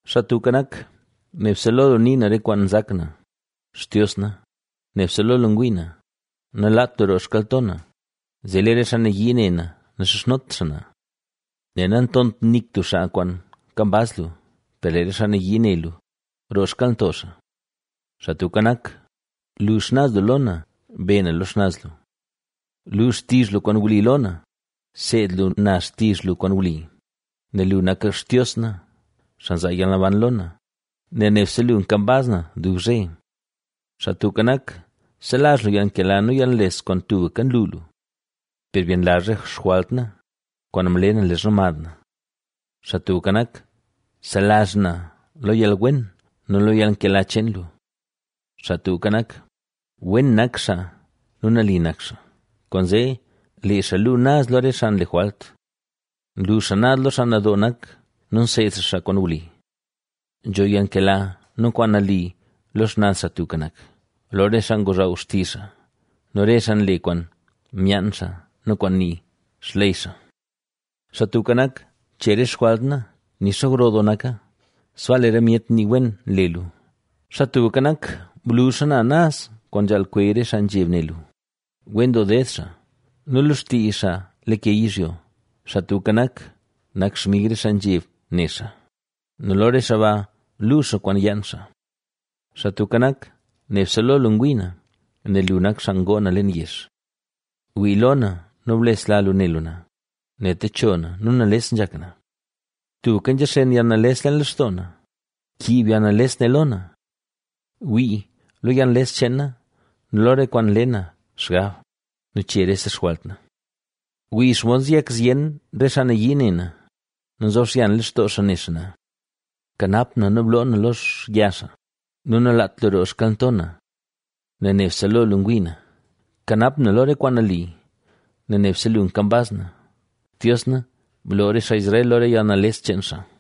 Xaa Tubka Nak, nebse lo lu nii na re kwaan nzak na, Xtios na, nebse lo lu ngwii na; nalaat lu roo xkalnto na, zee lee re xaa nayii ne na naxizhnot xaa na. ¡Nel natont nik tub xaa kwaan nkambaz lu! Per lee re xaa nayii ne lu, roo xkalnto xaa. Xaa Tubka Nak, lu xnaz lu lo na, be na lo xnaz lu. Lu xtizh lu kwaan wli lo na, seed lu na xtizh lu kwaan wli, nel lu nak Xtios na, xaa nzaa yalnaban lo na, nel nebse lu nkambaz na dub zhe. Xaa Tubka Nak, selazh lu yalnkela nu yalnles, kwaan tubka nlu lu. Per byenlazh re xjwalt na, kwaan mle na leezha mad na. Xaa Tubka Nak, selazh na, lo yalwen nu lo yalnkela cheen lu. Xaa Tubka Nak, wen nak xaa nu nali nak xaa, kwaanzee lee xaa luu naz lo re xaa nle jwalt. Nlu xaa naz lo xaa nadoo nak, nu nseed xaa xaa kwaan wli. Nzho yalnkela nu kwaan nali lo xnaz Xaa Tubka Nak, lo re xaa ngozhaw xtizh xaa, nu re xaa nle kwaan myaan xaa nu kwaan nii xley xaa. Xaa Tubka Nak, che re xjwalt na nixa gro doo naka, sbaa lee re myet nii wen le lu. Xaa Tubka Nak, blu xana naz kwaan nzhaal kweey re xaa nzheb ne lu. Wen doo ded xaa, nu lo xtii xaa lake yizhyo. Xaa Tubka Nak, nak xmig re xaa nzheb ne xaa nu lo re xaa ba luu xaa kwaan yaan xaa. Xaa Tubka Nak, nebse lo lu ngwii na, nel lu nak xaa ngoo na leen yex. Wii lo na nu blesla lu ne lu na, nel techo na nu nales nzhak na. Tubka nzhaxen yalnales leen lextoo na; kiib yalnales ne lo na. Wii, lo yalnales cheen na nu lo re kwaan nle na xgab nu che rese xjwalt na. Wii xomod nzeyak zyen re xaa nayii ne na nu nzob xyan lextoo xaa ne xaa na. Kanap na nu bloo na lozhya xaa nu nalaat lu roo xkalnto na, nel nebse lo lu ngwii na. Kanap na lo re kwaan nali, nel nebse lu kambaz na. ¡Xtios na, bloo re xaa Israel lo re yalnales cheen xaa!